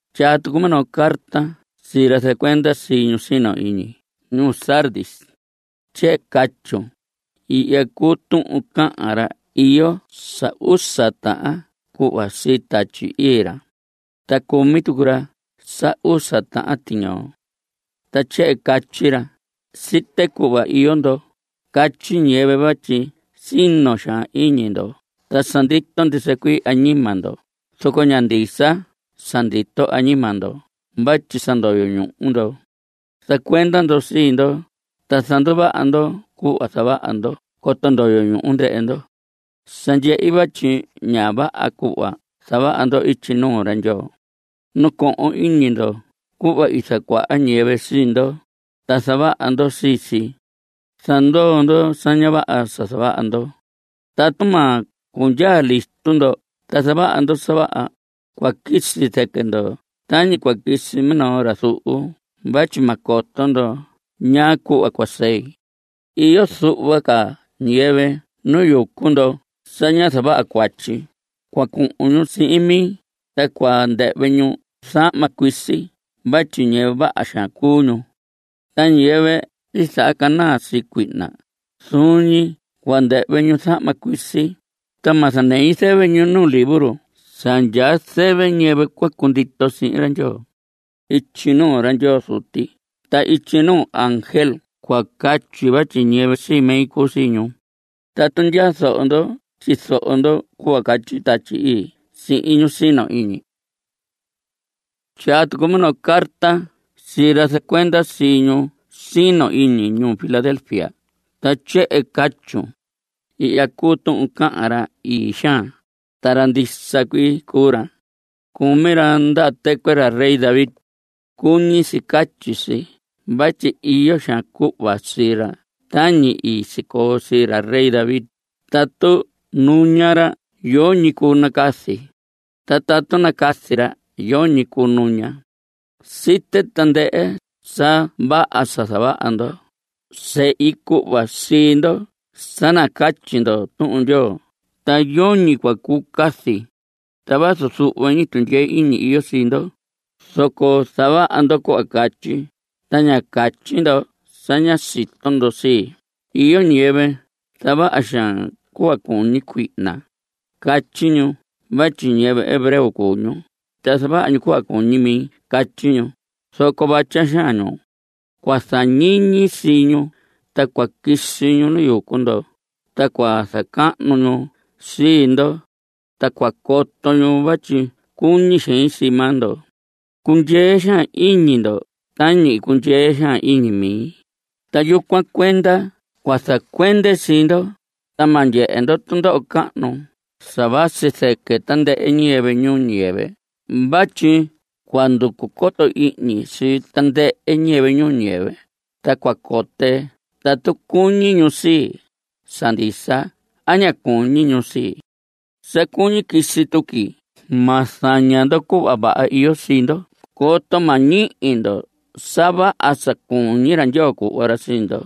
Tyaa tucun minoo carta sii ra zacuenda sii ñu sino iñi ñuu Sardis. Tyehen catyun: “Ihya cuu tuhun cahan ra iyo sa usa tahan cuhva sii Tatyi Ii ra. Ta cumi tucu ra sa usa tahan tiñoo, ta tyehen catyi ra: Site cuhva iyo ndo. Catyi ñiyɨvɨ vatyi sino xaan iñi ndo ta sa ndito ndisa cuii añima ndo, zoco ña ndisa sa ndito añima ndo vatyi sa ndoyo ñuhu ndo. Zacuenda ndo sii ndo, ta zanduvaha ndo cuhva zavaha ndo coto ndoyo ñuhu ndɨhɨ ndo. Sa ndyehi vatyi ña vaha cuhva zavaha ndo ityi nuu ra Ndyoo. Nacohon iñi ndo cuhva i zacuaha ñiyɨvɨ sii ndo, ta zavaha ndo sii si. Zandoo ndo sa ña vaha sa zavaha ndo. Tatu ma cundyaa listo ndo ta zavaha ndo sa vaha, cua quisi zɨquɨ ndo tañi cua quisi minoo ra zuhu vatyi ma coto ndo ñaa cuhva cua sei. Iyo zuhva ca ñiyɨvɨ nu yucu ndo sa ña zavaha cuatyi. Cua cuhun ñu sihin mi, ta cua ndɨhvɨ ñu zahma cuisi vatyi ñiyɨvɨ vaha xaan cuu ñu. Ta ñiyɨvɨ zahacanaa sii cuihna, zuun ñi cua ndɨhvɨ ñu zahma cuisi, ta ma zanei zɨvɨ ñu nu libro sa ndyaa zɨvɨ ñiyɨvɨ cua cundito sihin ra Ndyoo. Ityi nuu ra Ndyoo Zuti ta ityi nuu ángel cua catyi vatyi ñiyɨvɨ sii mi cuu sii ñu. Tatu ndyaa zoho ndo tyizoho ndo cuhva catyi Tatyi Ii sihin ñu sino iñi.” Tyaa tucun minoo carta sii ra zacuenda sii ñu sino iñi ñuu Filadelfia, ta tyehen catyun: “Ihya cuu tuhun cahan ra ii xaan, ta ra ndisa cuii cuu ra. Cumi ra ndaha tɨcuɨ ra rey David (cuñi si catyi si vatyi iyo xaan cuhva sii ra tañi i sicoo sii ra rey David), tatu nuña ra yoñi cuu nacazi. Ta tatu nacazi ra, yoñi cuu nuña. Site tandɨhɨ sa vaha sa zavaha ndo. Sehi cuhva sii ndo sa nacatyi ndo Tuhun Ndyoo, ta yoñi cua cuu cazi. Ta vazu zuhva ñi tundyee iñi iyo sii ndo, zoco zavaha ndo cuhva catyi, ta ña catyi ndo sa ña sito ndo sii. Iyo ñiyɨvɨ zavaha xaan cuhva cuñi cuihna. Catyi ñu vatyi ñiyɨvɨ hebreo cuu ñu, ta zavaha ñu cuhva cuñi mi catyi ñu, zoco vatya xaan ñu. Cua zañiñi sii ñu, ta cua quisi ñu nu yucu ndo, ta cua zacahnu ñu sii ndo. Ta cua coto ñu vatyi cuñi xein sii maa ndo. Cundyee xaan iñi ndo tañi i cundyee xaan iñi mi, ta yucuan cuenda cua zacuende sii ndo, ta ma ndyehe ndo tundoho cahnu sa vasi zɨquɨ tandɨhɨ ñiyɨvɨ ñuu ñiyɨvɨ vatyi cua nducu coto ihñi sii tandɨhɨ ñiyɨvɨ ñuu ñiyɨvɨ, ta cua cote tatu cuñi ñu sii, sa ndisa a ña cuñi ñu sii. Sa cuñi quisi tuqui. Ma zaña ndo cuhva vaha iyo sii ndo coto ma ñihi ndo sa vaha sa cuñi ra Ndyoo cuhva ra sii ndo.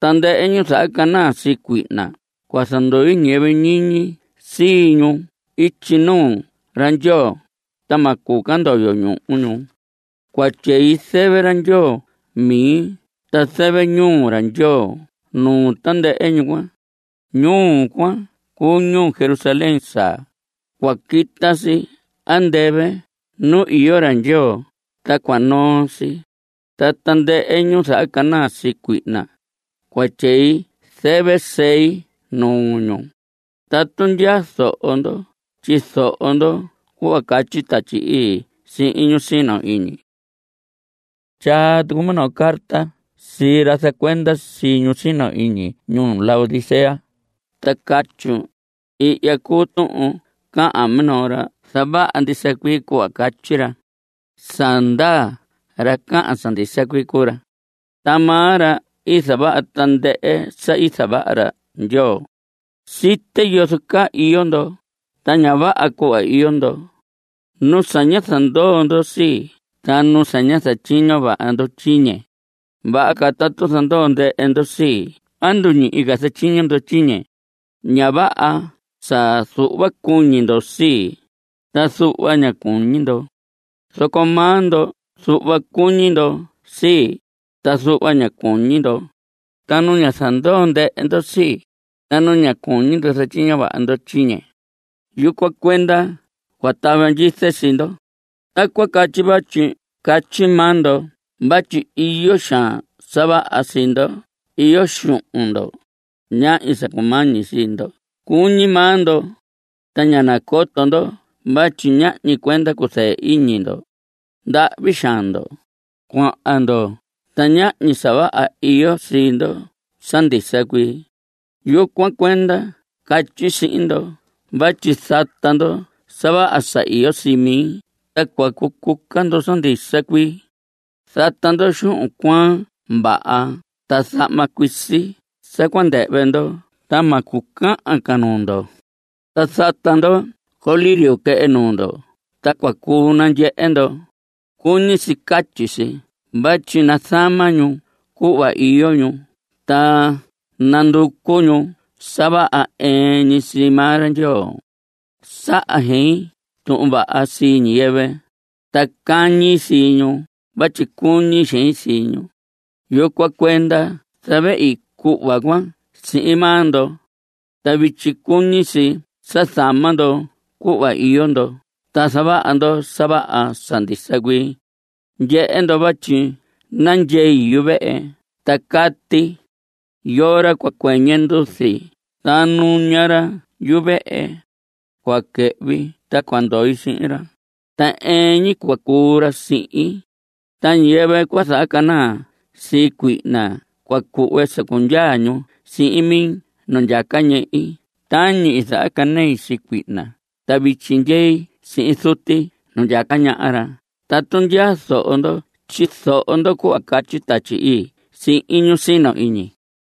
Tandɨhɨ ñu zahacanaa sii cuihna cua zandui ñiyɨvɨ ñiñi sii ñu ityi nuu ra Ndyoo, ta ma cuu ca ndoyo ñuhu ñu. Cua tyei zɨvɨ ra Ndyoo mi ta zɨvɨ ñuu ra Ndyoo nuu tandɨhɨ ñu cuan. Ñuu cuan cuu ñuu Jerusalén saa. Cua quita si andɨvɨ nu iyo ra Ndyoo, ta cua noo si. Ta tandɨhɨ ñu zahacanaa sii cuihna, cua tyei zɨvɨ sei nuu ñu. Tatu ndyaa zoho ndo tyizoho ndo cuhva catyi Tatyi Ii sihin ñu sino iñi.” Tyaa tucun minoo carta sii ra zacuenda sii ñu sino iñi ñuu Laodicea, ta catyun: “Ihya cuu tuhun cahan minoo ra zavaha ndisa cuii cuhva catyi ra. Sa ndaa, ra cahan sa ndisa cuii cuu ra. Ta maa ra i zavaha tandɨhɨ sa i zavaha ra Ndyoo. Site yozo caa iyo ndo, ta ña vaha cuhva iyo ndo. Nu sa ña zandoo ndo sii, ta nu sa ña zatyiño vaha ndo tyiñe. Vaha ca tatu zandoo ndɨhɨ ndo sii a nduñihi ca zatyiño ndo tyiñe. Ña vaha sa zuhva cuñi ndo sii, ta zuhva ña cuñi ndo. Zoco maa ndo zuhva cuñi ndo sii, ta zuhva ña cuñi ndo. Ta nu ña zandoo ndɨhɨ ndo sii, ta nu ña cuñi ndo zatyiño vaha ndo tyiñe. Yucuan cuenda cua tava ndyize sii ndo. Tacuan catyi vatyi catyi maa ndo vatyi iyo xaan sa vaha sii ndo. Iyo xuhun ndo. Ñahñi sa cumañi sii ndo cuñi maa ndo, ta ña nacoto ndo vatyi ñahñi cuenda cuzɨɨ iñi ndo. Ndahvi xaan ndo; cuaa ndo; ta ñahñi sa vaha iyo sii ndo sa ndisa cuii. Yucuan cuenda catyi sihin ndo vatyi zata ndo sa vaha sa iyo sii mi ta cua cucuca ndo sa ndisa cuii. Zata ndo xuhun cuaan vaha ta zahma cuisi sa cua ndɨhvɨ ndo ta ma cucahan ca nuu ndo. Ta zata ndo colirio quehe nuu ndo ta cua cuu nandyehe ndo. (Cuñi si catyi si vatyi nazama ñu cuhva iyo ñu ta nanducu ñu sa vaha ɨɨn ñi sii maa ra Ndyoo.) Saha xein tuhun vaha sii ñiyɨvɨ, ta cañi sii ñu vatyi cuñi xein sii ñu. Yucuan cuenda zavehi cuhva cuan sihin maa ndo. Ta vityi cuñi si sa zama ndo cuhva iyo ndo ta zavaha ndo sa vaha sa ndisa cuii. Ndyehe ndo vatyi nandyei yuvehe ta cati. Yoo ra cua cuɨñɨ nduzi ta nuña ra yuvehe, cua quɨhvi ta cua ndoi sihin ra. Ta ɨɨn ñi cua cuu ra sihin. Ta ñiyɨvɨ cua zahacanaa sii cuihna, cua cuhve sa cundyaa ñu sihin mi nu ndyaca ñehi tañi i zahacanei sii cuihna ta vityi ndyei sihin Zuti nu ndyaca ñaha ra. Tatu ndyaa zoho ndo tyizoho ndo cuhva catyi Tatyi Ii sihin ñu sino iñi.”